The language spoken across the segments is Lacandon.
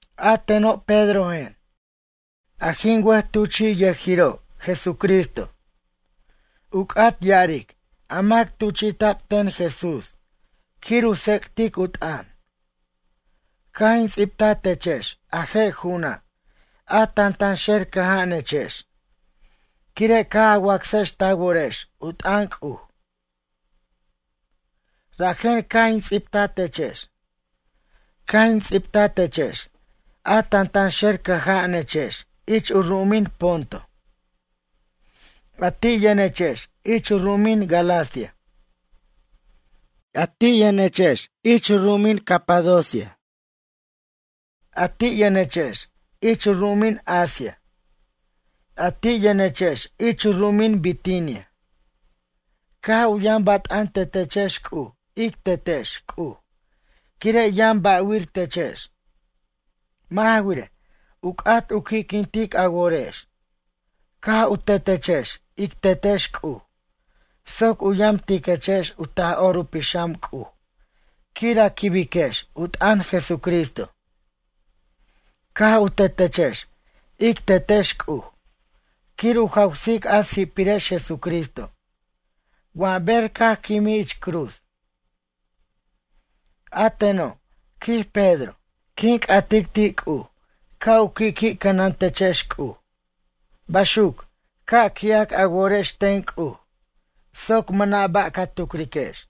A teno' Pedrojen, a jin wʌjtuchi'yʌjiro' Jesucristo. U c'at ya'aric a mac tuchi'ta'b ten Jesús quir u tsec'tic u t'ʌn. Caj in ts'ibta techex a je' ju'una', a tantanxer cʌja'anechex quire' caj a wacsex ta worex u t'ʌn C'uj. Rajen caj in ts'ibta techex. Caj in ts'ibta techex, a tantanxer cʌja'anechex ich u ru'umin Ponto. A ti' yʌnechex ich u ru'umin Galacia. A ti' yʌnechex ich u ru'umin Capadocia. A ti' yʌnechex ich u ru'umin Asia. A ti' yʌnechex ich u ru'umin Bitinia. Caj u yʌn bat'an tetechex C'uj ic Tetex C'uj quire' yʌn ba'wir techex. Mʌ' ja wirej, u c'at u qui'quintic a worex. Caj u tetechex ic Tetex C'uj soc u yamtiquechex u Taj'or u Pixam C'uj quir a quibiquex u t'ʌn Jesucristo. Caj u tetechex ic Tetex C'uj quir u jawsic a si'pirex Jesucristo wa ber caj quimij ich cruz. A teno', quij Pedro, quin c'atic ti' C'uj ca' u qui'qui' cʌnan techex C'uj, baxuc, ca' qui'ac a worex ten C'uj soc mʌna' ba' ca tucriquex.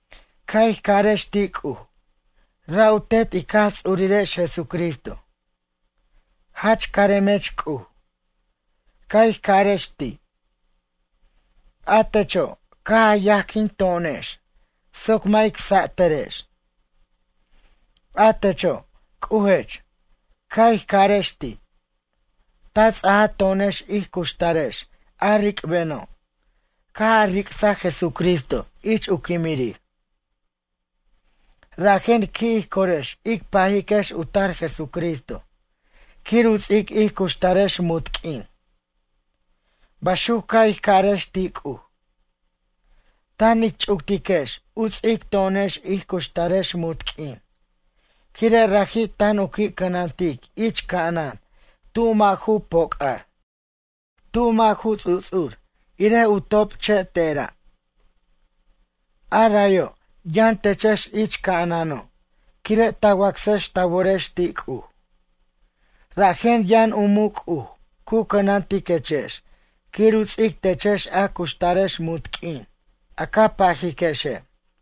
Ca' ij carex ti' C'uj, ra' u Tet ic Jaj Ts'urirex Jesucristo: “Jach caremech C'uj, caj ij ca'arex ti'. A techo' caj a yajquin to'onex soc mʌ' ic sa'tʌrex. A techo' C'ujech, caj ij ca'arex ti'. Ta ts'aja to'onex ij cuxtarex a ric'beno' caj a ric'saj Jesucristo ich u quimirir. Rajen qui' ij corex ic pajiquex u tar Jesucristo quir u ts'ic ij cuxtarex munt q'uin.” Baxuc ca' ij ca'arex ti' C'uj. Tan ic ch'uctiquex u ts'ic to'onex ij cuxtarex munt q'uin quire' raji' tan u qui' cʌnantic ich ca'anan tu mʌ' ju poc'ar. Tu mʌ' ju ts'uts'ur irej u top che' tera'. A rayo' yʌn techex ich ca'anano' quire' ta wacsex ta worex ti' C'uj. Rajen yʌn u muc' C'uj cu cʌnantiquechex quir u ts'ic techex a cuxtarex munt q'uin, a ca pajiquexe'.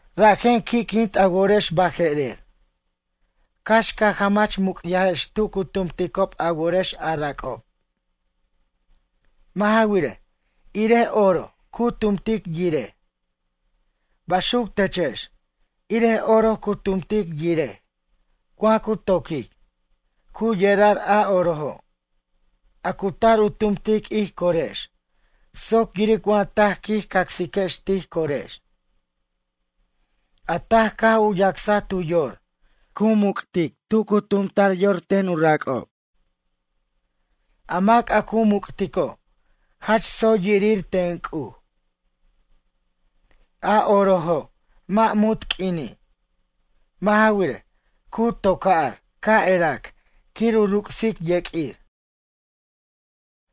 Rajen qui'quint a worex baje'rer. Cax ca jamach muc'yajex tu cu tumticob a worex a rac'ob. Mʌ' ja wirej, irej oro cu tumtic yirej. Baxuc techex, irej oro cu tumtic yirej wa cu to'quic, cu yerar a orojo'. A cu tar u tumtic ij corex soc yiric wa taj quij cacsiquex tij corex. A taj caj u yacsaj tu yor, cu muc'tic tu cu tumta'r yor ten u rac'ob. A mac a cu muc'tico', jach tsoy yirir ten C'uj. A orojo' mʌ' munt q'uini'. Mʌ' ja wirej, cu to'ca'r ca' erac quir u ruc'sic yeq'uir.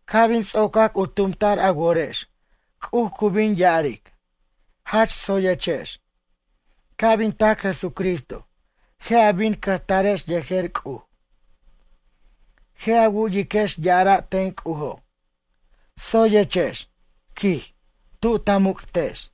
Ca' bin ts'ocac u tumta'r a worex C'uj cu bin ya'aric: Jach tsoyechex. Ca' bin tac Jesucristo, je' a bin cʌjtarex yejer C'uj. Je' a wu'yiquex ya'ara' ten C'ujo': “Tsoyechex, quij, tu ta muc'tex.”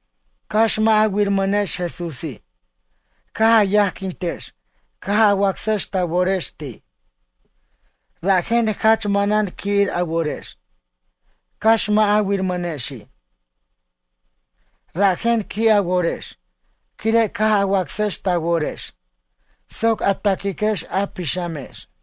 Cax mʌ' a wirmʌnex Jesúsi', caj a yajquintex caj a wacsex ta worex ti'. Rajen jach manan qui'ir a worex, cax mʌ' a wirmʌnexi'. Rajen qui' a worex quire' caj a wacsex ta worex soc a taquiquex a pixamex.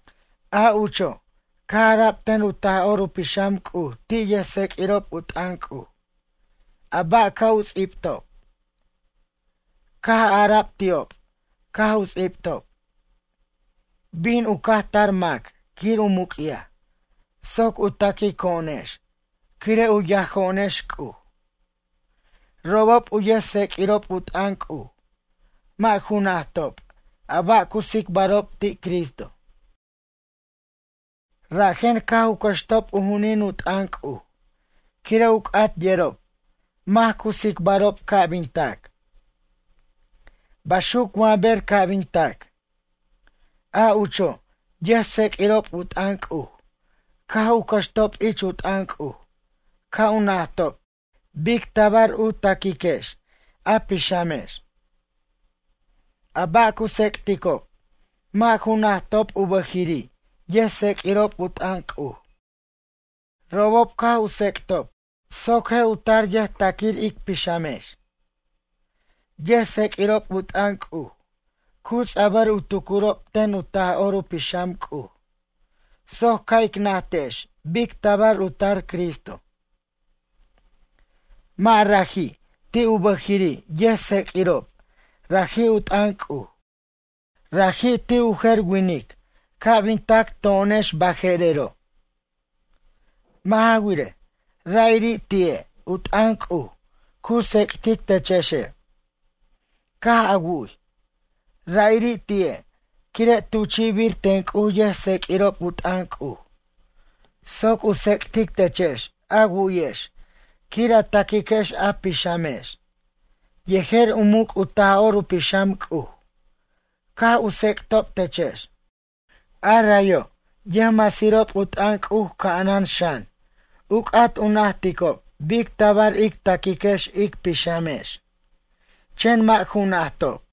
A ucho' caj ara'b ten u Taj'or u Pixam C'uj ti' yʌjtseq'uirob u t'ʌn C'uj, a ba' ca' u ts'ibtob. Caj ara'b ti'ob caj u ts'ibtob: “Bin u caj tar mac quir u muc'yaj soc u taquico'onex quire' u yajo'onex C'uj.” Robob u yʌjtseq'uirob u t'ʌn C'uj mʌ' ju najtob a ba' cu tsicbarob ti' Cristo. Rajen caj u cʌxtob u ju'unin u t'ʌn C'uj quire' u c'at yerob mac cu tsicbarob ca' bin tac. Baxuc wa ber ca' bin tac. A ucho', yʌjtseq'uirob u t'ʌn C'uj caj u cʌxtob ich u t'ʌn C'uj ca' u najtob bic tabar u taquiquex a pixamex. A ba' cu tsec'ticob mʌ' ju najtob u bʌjiri' yʌjtseq'uirob u t'ʌn C'uj. Robob caj u tsec'atob soc je' u tar yʌjtaquir ic pixamex. Yʌjtseq'uirob u t'ʌn C'uj cu ts'abʌr u tucurob ten u Taj'or u Pixam C'uj soc ca' ic najtex bic tabar u tar Cristo. Mʌ' raji' ti' u bʌjiri' yajtseq'uirob raji' u t'ʌn C'uj, raji' ti' u jer winic ca' bin tac, to'onex baje'rero'. Mʌ' ja wirej, ra'iri' ti'e' u t'ʌn C'uj cu tsec'tic techexe'. Caj a wu'y. Ra'iri' ti'e', quire' tuchi'bir ten C'uj yʌjtseq'uirob u t'ʌn C'uj soc u tsec'tic techex a wu'yex quir a taquiquex a pixamex. Yejer u muc' u Taj'or u Pixam C'uj caj u tsec'tob techex. A rayo' yʌjmasirob u t'ʌn C'uj ca'anan xan u c'at u najticob bic tabar ic taquiquex ic pixamex. Chen mʌ' ju najtob.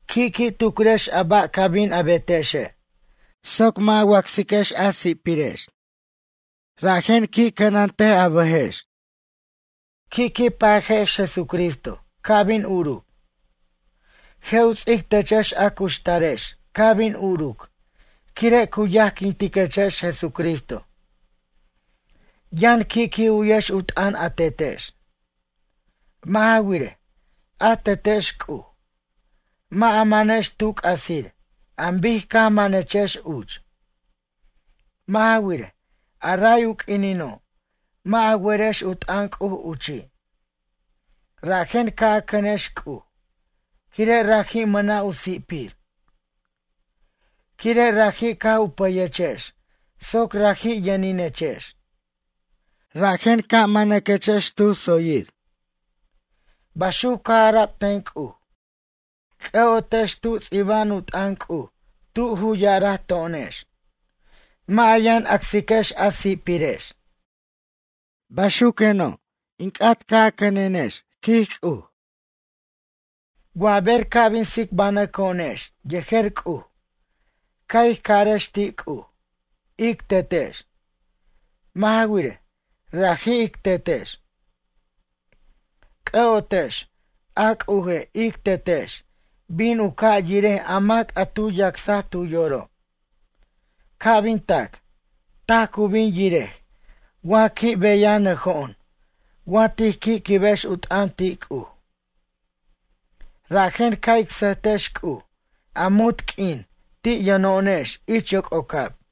Qui'qui' tucrex a ba' ca bin a betexe' soc mʌ' a wacsiquex a si'pirex. Rajen qui' cʌnant a bʌjex. Qui'qui' pajex Jesucristo ca' bin uruc. Je' u ts'ic techex a cuxtarex ca' bin uruc quire' cu yajquintiquechex Jesucristo. Yʌn qui'qui' u'yex u t'ʌn a Tetex. Mʌ' ja wirej, a Tetex C'uj. Mʌ' a manex tu c'asir an bic caj manechex uch. Mʌ' ja wirej, a ray u q'uinino' mʌ' a werex u t'ʌn C'uj uchi'. Rajen ca' a cʌnex C'uj, quire' raji' mʌna' u si'pir. Quire' raji' caj u pʌyechex soc raji' yʌninechex. Rajen caj manaquechex tu tsoyir. Baxuc caj ara'b ten C'uj. C'ʌ'otex tu ts'iba'an u t'ʌn C'uj tu ju ya'araj to'onex: “Mʌ' a yʌn acsiquex a si'pirex. Baxuqueno', in c'at ca' a cʌnenex, quij C'uj.” Wa ber ca' bin tsicbanʌco'onex yejer C'uj. Ca' ij carex ti' C'uj: “Ic Tetex.” Mʌ' ja wirej, raji' ic Tetex. C'ʌ'otex, a C'uje' ic Tetex bin u ca' yirej a mac a tu yacsaj tu yoro'. Ca' bin tac, taj cu bin yirej wa qui' beyanʌjo'on wa tij qui' quibex u t'ʌn ti' C'uj. Rajen ca' ic sʌjtex C'uj a munt q'uin ti' yʌno'onex ich yoc'ocab.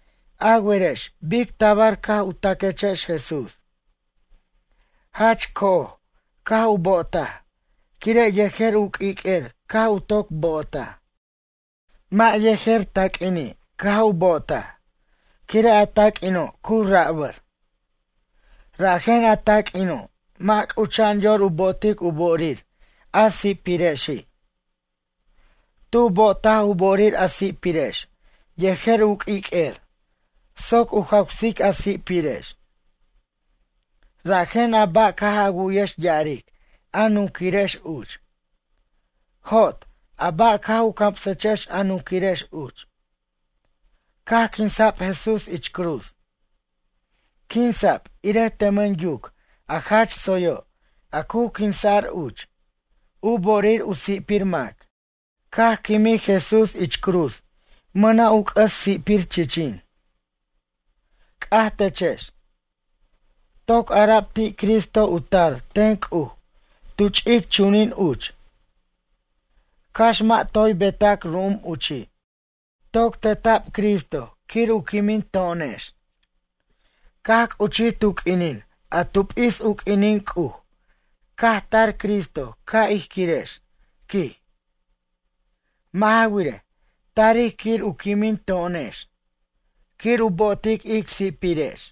A werex bic tabar caj u taquechex Jesús. Jach co'oj caj u bo'otaj, quire' yejer u q'uiq'uer caj u toc bo'otaj. Mʌ' yejer taq'uini' caj u bo'otaj, quire' a taq'uino' cu rabʌr. Rajen a taq'uino' mʌ' c'ucha'an yor u bo'otic u bo'orir a si'pirexi'. Tu bo'otaj u bo'orir a si'pirex yejer u q'uiq'uer soc u jawsic a si'pirex. Rajen a ba' caj a wu'yex ya'aric a nunquirex uch. Jot, a ba' caj u camsechex a nunquirex uch. Caj quinsa'b Jesús ich cruz. Quinsa'b irej tʌmʌn yuc a jach tsoyo' a cu quinsa'r uch, u bo'orir u si'pir mac. Caj quimij Jesús ich cruz mʌna' c'ʌs si'pir chichin. C'aj techex. Toc ara'b ti' Cristo u tar ten C'uj tu ch'ic chunin uch. Cax mʌ' toy beta'c ru'um uchi'. Toc teta'b Cristo quir u quimin to'onex. Caj c'uchij tu q'uinin a tu p'is u q'uinin C'uj caj tar Cristo caj ij quirex, quij. Mʌ' ja wirej, tarij quir u quimin to'onex. Quir u bo'otic ic si'pirex.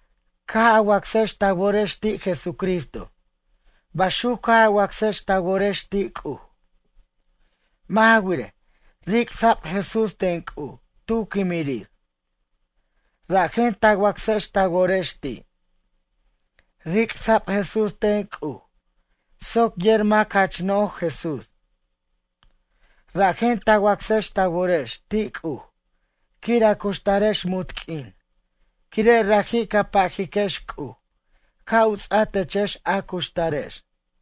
Caj a wacsex ta worex ti' Jesucristo baxuc caj a wacsex ta worex ti' C'uj. Mʌ' ja wirej, ric'sa'b Jesús ten C'uj tu quimirir. Rajen ta wacsex ta worex ti'. Ric'sa'b Jesús ten C'uj soc yer mac jach no'j Jesús. Rajen ta wacsex ta worex ti' C'uj quir a cuxtarex munt q'uin quire' raji' ca pajiquex C'uj ca' u ts'a techex a cuxtarex.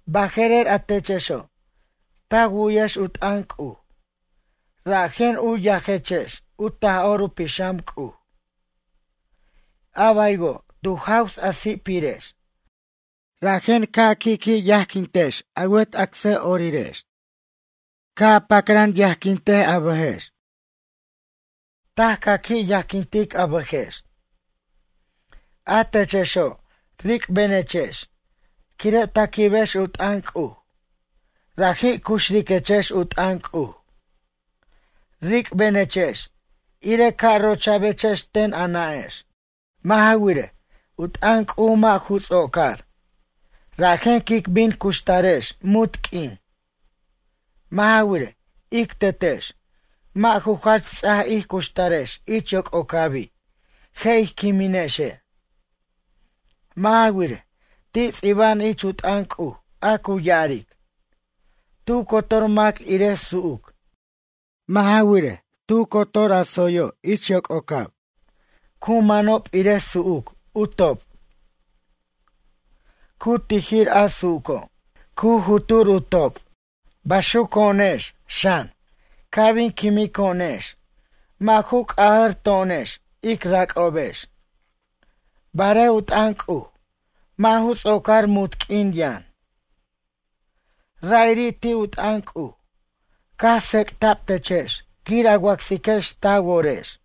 Baje'rer a techexo', ta wu'yex u t'ʌn C'uj, rajen u yajechex u Taj'or u Pixam C'uj. A baywo' tu jaws a si'pirex, rajen ca qui'qui' yajquintiquechex a wet acsʌ'orirex. Ca' a pacran yajquint a bʌjex. Taj ca qui' yajquint a bʌjex. A techexo' ric'benechex quire' ta quibex u t'ʌn C'uj, raji' cuxriquechex u t'ʌn C'uj. Ric'benechex ire ca' rocha'bechex ten a nʌ'ex. Mʌ' ja wirej, u t'ʌn C'uj mʌ' ju ts'ocar, rajen quic bin cuxtarex munt q'uin. Mʌ' ja wirej, ic tetex, mʌ' ju jach ts'aj ij cuxtarex ich yoc'ocabi' je' ij quiminexe'. Mʌ' ja wirej, ti' ts'iba'an ich u t'ʌn C'uj a cu ya'aric: Tu cotor mac irej su'uc. Mʌ' ja wirej, tu cotor ju tsoyo' ich yoc'ocab, cu manob irej su'uc u top'. Cu tijir a su'uco', cu jutur u top'. Baxuco'onex, xan, ca' bin quimico'onex mʌ' ju c'ajʌrto'onex ic rac'obex. Barej u t'ʌn C'uj, mʌ' ju ts'ocar munt q'uin yʌn. Ra'iri' ti' u t'ʌn C'uj, caj tsec'ta'b techex quir a wacsiquex ta worex.